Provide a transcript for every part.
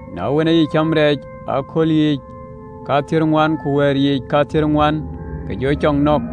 Na wën, acï cäm rɛɛc ë cool yiic kathiërŋuan ku wɛ̈ɛ̈r yiic kathiërŋuan, ke jɔ cɔk nɔ̈k.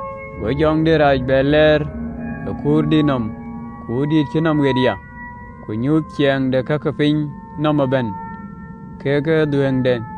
Go jɔŋdït rac lɛɛr ë kuurdït nɔm, kuurdïït cï nɔm ɣet ya, ku nyuth ciɛɛŋ ke piny nɔm ëbɛ̈n kekë dhuëëŋden,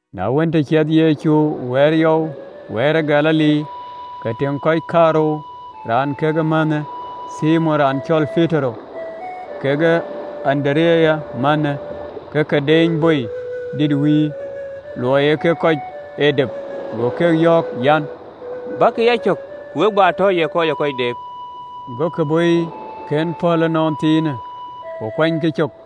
Na wën, të ciɛthë Yecu ë Baar ë Galili yɔu, ke tïŋ kɔc kaarou, raan kekë mänhë, Thimon raan cɔl Petero kekë Andereya mänhë, ke ke deeny bɔi dït wïïr, luɔi ee kek kɔc ee dep. Go keek yɔ̈ɔ̈k an, “Bäkï ë yacök, ku we bä tɔ ye kɔc ë kɔc deep.” Gokï bɔɔiken pɔ̈l ënɔɔnthiinë, ku kuanykï cök,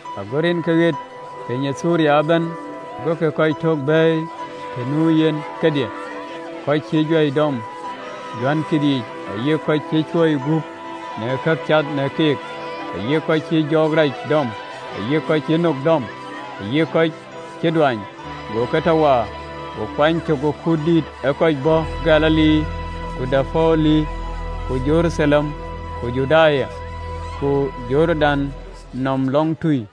Ago rinke ɣet piny ë Thiriya ëbɛ̈n, gokï kɔc tök bɛ̈ɛ̈i të nu yen kedhie, kɔc cïï juäi dɔm, juäi kithic, ayï kɔc cï cuil gup në kë cath ke keek, ayï kɔc cïï jɔɔk rac dɔm, ayï kɔc cïï nok dɔm, ayï kɔc cï duany, go ke tɔ waar. Go kuany cök ë kut dïït ë kɔc bɔ̈ Galili, ku Dekapoli, ku Jeruthalem, ku Juda, ku Jordan nɔm lɔŋtui.